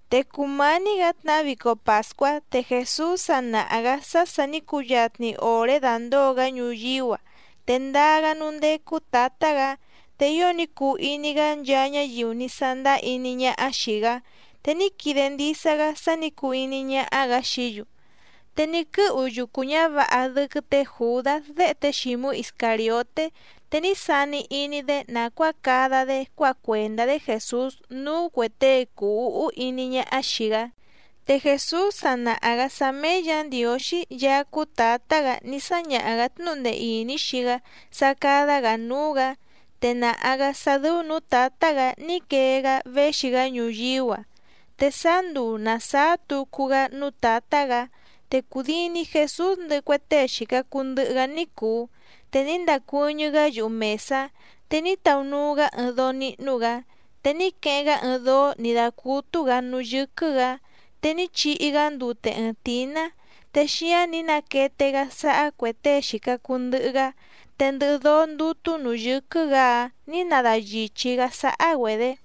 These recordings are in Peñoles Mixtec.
Te cùmání‑gǎ tnahá vico pàscuá, te Jèsús sa nàha‑gá sá sà ní cuyatni òré dàndóo‑gá ñuyíú‑a, te ndaa‑gá núú ndécú Tǎtá‑gǎ. Te ío ní cuu iní‑gá nchaa ñáyiu ní sándáá iní ñáhá xìi‑gá, te ní quide ndisa‑gá sá nǐ cuu iní ñáhá‑gǎ xií‑yu. Te ní quɨ́hu yucu ñǎvǎha dɨ́quɨ́ tě Jùdás déhe té Xǐmú Iscàrioté, te ní sani iní‑dé nàcuáa cada‑dé cuáha cuèndá‑dé Jèsús núú cuè tée cùu úhú iní ñáhá xìi‑gá. Te Jèsús sa nàha‑gá sá méé Yǎ Ndiǒxí Yaá cúú Tǎtá‑gǎ ní sáñaha‑gǎ tnúhu ndee ìní xii‑gá sá cádá‑gǎ núú‑gǎ, te nàha‑gá sá dɨ́ú nǔú Tǎtá‑gǎ ní quee‑gá véxi‑gá ñuyíú‑a. Te sáá nduu nàsáá tucu‑gá núú Tǎtá‑gǎ. Te cùdini Jesús ndɨhɨ cue tée xìca cuu ndɨhɨ‑gá ní cùu, te ní ndacuɨ́ñɨ́‑gá yuhu mèsá, te ní taunuu‑gá ɨɨⁿ dóó níhnú‑gǎ, te ní queheⁿ‑gá ɨɨⁿ dóó nǐ dácútú‑gǎ núú yɨ́quɨ́‑gǎ. Te ní chihi‑gá ndute ɨɨⁿ tǐná, te xíáⁿ nǐ naquete‑gá sáhá cuè tée xìca cuu ndɨhɨ‑gá, te ndɨhɨ dóó ndútú nǔú yɨ́quɨ́‑gǎ‑áⁿ nǐ nadayìchí‑gá sáhá‑güedě.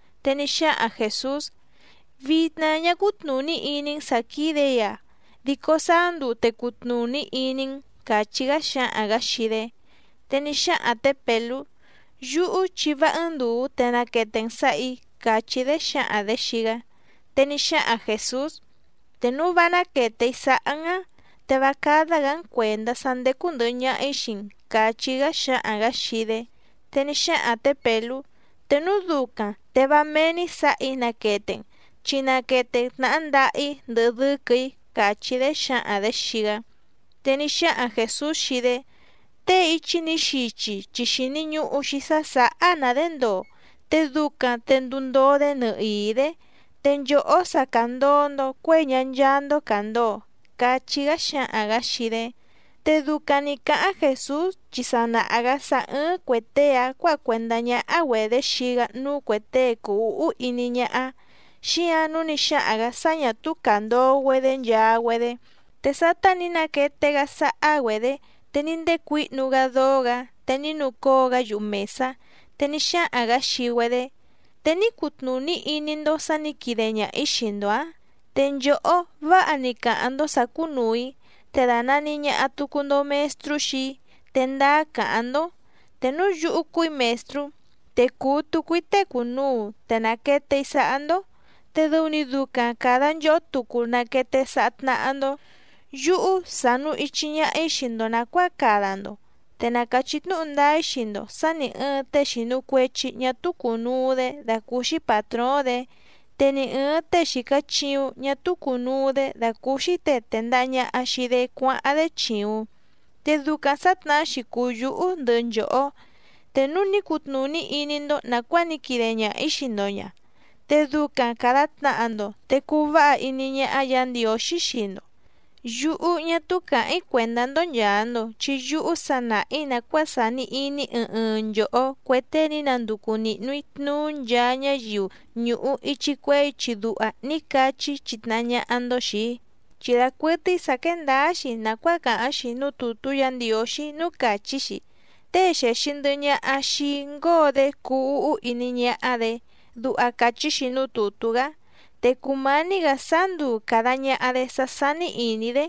Te ní xáhaⁿ Jèsús: —Vitna ñá cútnùní iní‑n sǎ quídè‑í‑a dico sáá nduu te cutnùní iní‑n —càchí‑gá xáhaⁿ‑gǎ xii‑dé. Te ní xáhaⁿ tě Pèlú: —Yúhú chi vá ɨ́ɨ́ⁿ ndùu te naquete‑n sǎhà‑í —càchí‑dé xǎhaⁿ‑dě xii‑gá. Te ní xáhaⁿ Jèsús: —Te núu vá náquète‑í sáhá‑n áⁿ, te vá cádá‑gǎ‑n cuèndá sá ndécú ndɨ̀hɨ ñaha‑í xii‑n —càchí‑gá xáhaⁿ‑gǎ xii‑dé. Te ní xáhaⁿ tě Pèlú: —Te núu ducaⁿ te vá méé‑ní sǎhà‑í naquete‑n, chi naquete‑n tnàhá ndaha‑í ndɨhɨ dɨ́quɨ̀‑í —càchí‑dé xǎhaⁿ‑dě xii‑gá. Te ní xáhaⁿ Jèsús xii‑dé: —Tée íchí nǐ xichi chi xìni ñuhu‑xi sá sǎhá‑na‑dě ndoo, te ducaⁿ te nduu ndoo‑dé nɨhìí‑dé. Te nchòhó sa càndoo‑ndo cuéi ñá ncháá‑ndó càndoo —cachí‑gá xáhaⁿ‑gǎ xii‑dé. Te ducaⁿ nǐ cáháⁿ Jèsús chi sa nàha‑gá sá ɨ́ɨ́ⁿ cuè tée‑áⁿ cuǎha cuèndá ñáhá‑güedě xii‑gá núú cuè tée cùu úhú iní ñáhá, xíǎⁿ nǔu ní xáhaⁿ‑gǎ sá ñà túú càndoo‑güedé nchaa‑güedé. Te sátá nǐ naquete‑gá sáhá‑güedě, te ní ndécuǐhnu‑gá dóó‑gǎ, te ní nucóo‑gá yuhu mèsá, te ní xáhaⁿ‑gǎ xii‑güedé: —¿Te ní cutnùní iní‑ndó sǎ nǐ quide ñaha‑ǐ xii‑ndo‑ǎⁿ? Te nchòhó váha‑ni càháⁿ‑ndó sǎ cúnùu‑í, te dànani ñaha tucu‑ndo Mestrú xii‑í, te ndáá càháⁿ‑ndó. Te núu yúhú cúù‑í Mèstrú, te cùu tucu‑í tée cùnuu te nàquete‑í sáhá‑ndó, te dɨu‑ni ducaⁿ càda nchohó tucu naquete sáhá tnáhá‑ndó. Yúhú sànu ichi ñaha‑í xii‑ndo nàcuáa cada‑ndo. Te na càchí tnúhu ndáá‑í xii‑ndo sǎ nì ɨɨⁿ tée xìnu cuechi ñá túú cùnuu‑dé dàcúúxí pàtróóⁿ‑dě, te ni ɨ̀ɨⁿ tée xìca chiuⁿ ñá túú cùnuu‑dé dàcúúxí těe tèndaha ñaha xii‑dé cuáháⁿ‑dé chìuⁿ. Te ducaⁿ sǎtnahá‑xi cùu yúhú ndɨhɨ nchòhó. Te núu ní cutnùní iní‑ndó nàcuáa ní quide ñaha‑ǐ xii‑ndo ña, te ducaⁿ càda tnaha‑ndo te cuu váha iní ñáhá Yǎ Ndiǒxí xii‑ndo. ’Yúhú, ñá túú càháⁿ‑í cuèndá‑ndó nchàa‑ndo, chi yúhú sa nàha‑í nàcuáa sàni iní ɨɨⁿ ɨɨⁿ nchòhó cue tée ní nanducu nìhnu‑í tnuú nchaa ñáyiu ñùhu ichi cuehé ichi duha ní cachí‑í chitnahá ñáhá‑ndó xìi‑í. Chi dacuɨtɨ́í sǎ quéé ndǎá‑xi nàcuáa càháⁿ‑xi núú tùtú Yǎ Ndiǒxí núú càchí‑xi: “Tée xèxi ndɨhɨ ñaha xii‑í ngóo‑dé cuu úhú iní ñáhá‑dě”, duha càchí‑xi núú tùtú‑gá. Te cùmání‑gǎ sáá nduu càda ñaha‑dé sá sání ìní‑dé,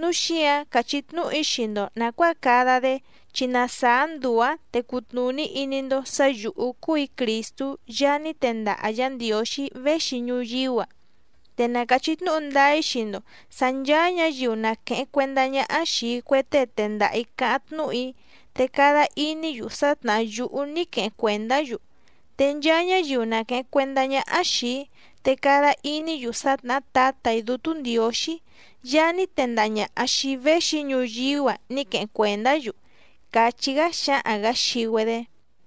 núu xíǎⁿ càchí tnúhu‑í xii‑ndo nàcuáa cada‑dé, chi na sàá nduu‑ǎⁿ te cutnùní iní‑ndó sǎ yǔhú cúù‑í Crìstú Yaá ní tendaha Yǎ Ndiǒxí véxi ñuyíú‑a. Te na càchí tnúhu ndáá‑í xii‑ndo sǎ nchàa ñáyiu na quèheⁿ cuendá ñáhá xìi cue tée tendaha‑ǐ cáháⁿ tnúhu‑í, te cada iní‑yu sá tnàhá yúhú ní queheⁿ cuèndá‑yu. Te nchaa ñáyiu na quèheⁿ cuendá ñáhá xìi‑í, te cada iní‑yu sá tnàhá Tǎtà‑í Dútú Ndiǒxí Yaá ní tendaha ñàha xii‑í véxi‑í ñuyíú‑a ní queheⁿ cuèndá‑yu —càchí‑gá xáhaⁿ‑gǎ xii‑güedé.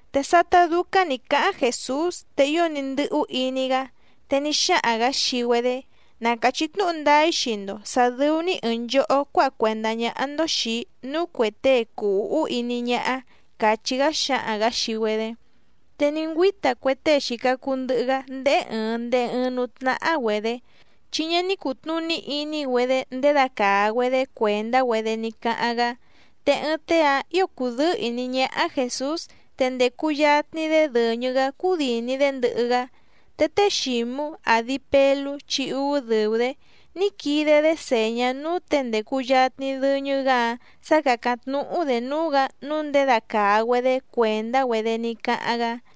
Te sátá dúcáⁿ nǐ cáháⁿ Jèsús te ío ní ndɨ́hú iní‑gá, te ní xáhaⁿ‑gǎ xii‑güedé: —Na càchí tnúhu ndáá‑í xii‑ndo sǎ dɨ́ú‑ní ɨ̀ɨⁿ nchohó cuáha cuèndá ñáhá‑ndó xìi‑í núú cuè tée cùu úhú iní ñáhá —càchí‑gá xáhaⁿ‑gǎ xii‑güedé. Te ní ngüíta cue tée xìca cuu ndɨhɨ‑gá ndéhé ɨ̀ɨⁿ ndehe ɨɨⁿ núú tnáhá‑güedě, chi ñá ní cùtnuní iní‑güedé ndědacàa‑güedé cuèndá‑güedé ní cáháⁿ‑gá. Te ɨɨⁿ tée‑áⁿ ǐo cùdɨ́ɨ́ ìní ñáhá Jèsús, te ndècu yatni‑dé dɨ̀ñɨ‑gá cúdìni‑dé ndɨhɨ‑gá. Te té Xǐmú, àdi Pelú chi úú dɨ̀u‑dé, ní quide‑dé sèñá núú těe ndècu yatni dɨñɨ‑gá‑áⁿ sá càcáⁿ tnúhú‑dě núú‑gǎ nǔu ndědacàa‑güedé cuèndá‑güedé ní cáháⁿ‑gá.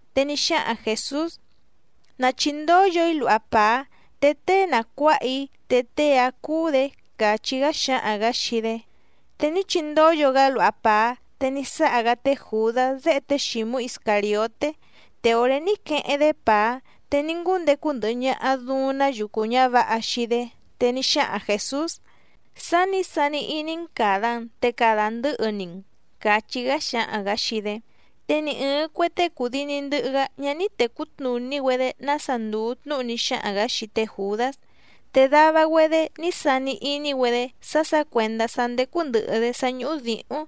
Te ní xáhaⁿ Jèsús: —Na chìndóyo‑í luha pàá, te tée na cuǎha‑í te tée‑áⁿ cúú‑dě —càchí‑gá xáhaⁿ‑gǎ xii‑dé. Te ní chindóyo‑gá luha pàá, te ní sáha‑gá té Jùdás déhe té Xǐmú Iscàrioté. Te òré ní queheⁿ‑dé pàá, te ní ngúndecu ndɨhɨ ñaha dùuⁿ‑ná yucu ñǎvǎha xii‑dé. Te ní xáhaⁿ Jèsús: —Sá nǐ sani iní‑n càda‑n te cada ndɨ̌hɨ‑ni‑n —càchí‑gá xáhaⁿ‑gǎ xii‑dé. Te ni ɨ̀ɨⁿ cue tée cùdini ndɨhɨ‑gá ñá ní tècú tnùní‑güedé nása ndùu tnúhu ní xáhaⁿ‑gǎ xii té Jùdás. Te dava‑güedé ní sani iní‑güedé sá sǎ cuèndá sá ndécú ndɨ̀hɨ‑dé sá ñúhú dǐhúⁿ,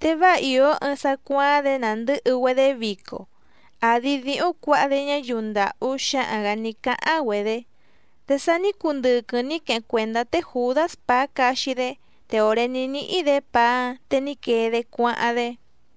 te váa ìó ɨɨⁿ sá cuááⁿ‑dě nàndɨ́hɨ‑güedé vico, àdi díhúⁿ cuǎha‑dé ñáyiu ndàhú xáhaⁿ‑gǎ ní cáháⁿ‑güedě. Te sa ní cundɨquɨⁿ ní queheⁿ cuèndá té Jùdás pàá caxi‑dé, te òré ní níhí‑dě pàá‑áⁿ te ní quee‑dé cuáháⁿ‑dé.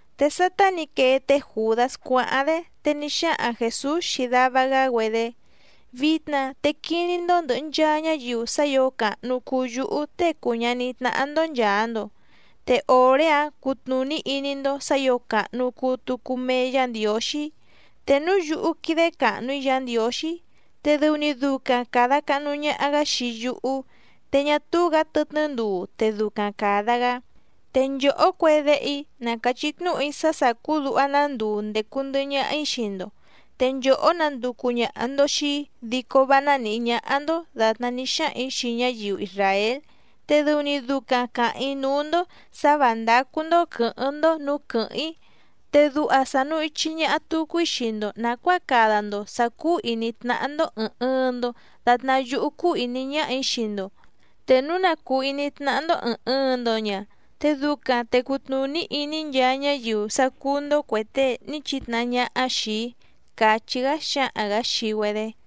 Te sátá nǐ quee té Jùdás cuáháⁿ‑dé, te ní xáhaⁿ Jèsús xii dava‑gá‑güedé: —Vitna te quiní‑ndó ndɨ̀hɨ nchaa ñáyiu sá ǐo càhnu cuu yúhú Tée cùu ñaní tnáhá‑ndó nchàa‑ndo, te òré‑áⁿ cutnùní iní‑ndó sǎ ǐo càhnu cuu tucu mee Yá Ndiǒxí. Te núu yúhú quídé càhnu‑í Yǎ Ndiǒxí, te dɨu‑ni ducaⁿ càda cahnu ñaha‑gá xii yúhú, te ñá túú‑gǎ tɨtnɨ́ nduu te ducaⁿ càda‑gá. Te nchòhó cue déhe‑í na càchí tnúhu‑í sá sàcú duha‑ná nduu ndècu ndɨhɨ ñaha‑í xii‑ndo. Te nchòhó nanducu ñàha‑ndo xii‑í dico vá ná nìhí ñáhá‑ndó dàtná ní xáhaⁿ‑ǐ xii ñáyiu isràél, te dɨu‑ni ducaⁿ càháⁿ‑í núú‑ndó sǎ vǎ ndácú‑ndó quɨ̌hɨ́ⁿ‑ndó nǔú quɨ̀hɨ́ⁿ‑í. Te duha sànu ichi ñaha tucu‑í xii‑ndo nàcuáa cada‑ndo sǎ cúú ìní tnáhá‑ndó ɨ̀ɨⁿ ɨɨⁿ‑ndo datná yúhú cúú ìní ñáhà‑í xii‑ndo. Te núu na cùu iní tnáhá‑ndó ɨ̀ɨⁿ ɨɨⁿ‑ndo ña, te ducaⁿ te cutnùní iní nchaa ñáyiu sá cúú‑ndó cuè tée ní chitnahá ñáhá xìi‑í —càchí‑gá xáhaⁿ‑gǎ xii‑güedé.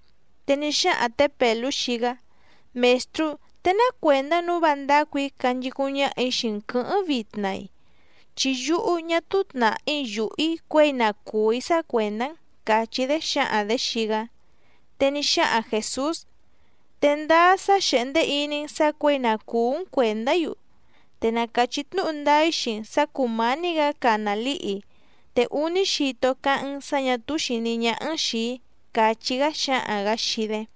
Te ní xáhaⁿ tě Pèlú xii‑gá: —Mèstrú, ¿te ná cuèndá nǔu vá ndácù‑í canchicúⁿ ñáhà‑í xii‑n quɨ̌hɨ́ⁿ vitna‑i? Chi yúhú ñá túú tnàhí yùhú‑í cuěi na cùú‑í sá cuèndá‑n —càchí‑dé xǎhaⁿ‑dě xii‑gá. Te ní xáhaⁿ Jèsús: —¿Te ndáá sá xèhndé iní‑n sǎ cuěi na cùú‑n cuèndá‑í‑u? Te na càchí tnúhu ndáá‑í xii‑n sǎ cùmání‑gǎ cana lǐhi, te úní xito cáháⁿ‑n sǎ ñà túú xìní ñáhá‑n xìi‑í —càchí‑gá xáhaⁿ‑gǎ xii‑dé.